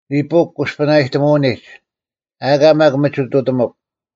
ᓂᐳᐅᒄ ᑯᔅᐸᓇᔨᑎᒧᐅᓂᒡ, ᐊᑲ ᒪᒃ ᒥᒋᑐᑎᒧᒄ: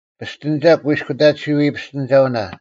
ᐱᔅᑎᓂᒐᒄ ᑯᐃᔅᑯᑕᑎᓱᐎ ᐱᔅᑎᓂᒐᐅᓇ,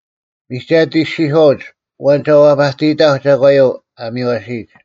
ᒥᒐᑦ ᐃᔅᒋᔄᐅᒡ, “ᐊᐛᓐ ᒐ ᐛᐸᑎᔨᑕᐧᒄ ᒐᒂᔪᐤ ᐊ ᒥᔽᓯᔨᒡ?”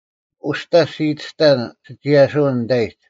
ᐅᔅᑕ ᔅᒋ ᐃᑎᔅᑕᓐ ᓯᒋᔭᓯᐅᓐ ᓂᑕᐃᒡ,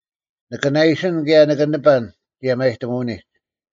ᓂᑭ ᓇᐃᓯᓐ ᑭᔭ ᓂᑭ ᓂᐸᓐ ᒋᔭᒪᔨᑎᒧᐅᓂᒡ;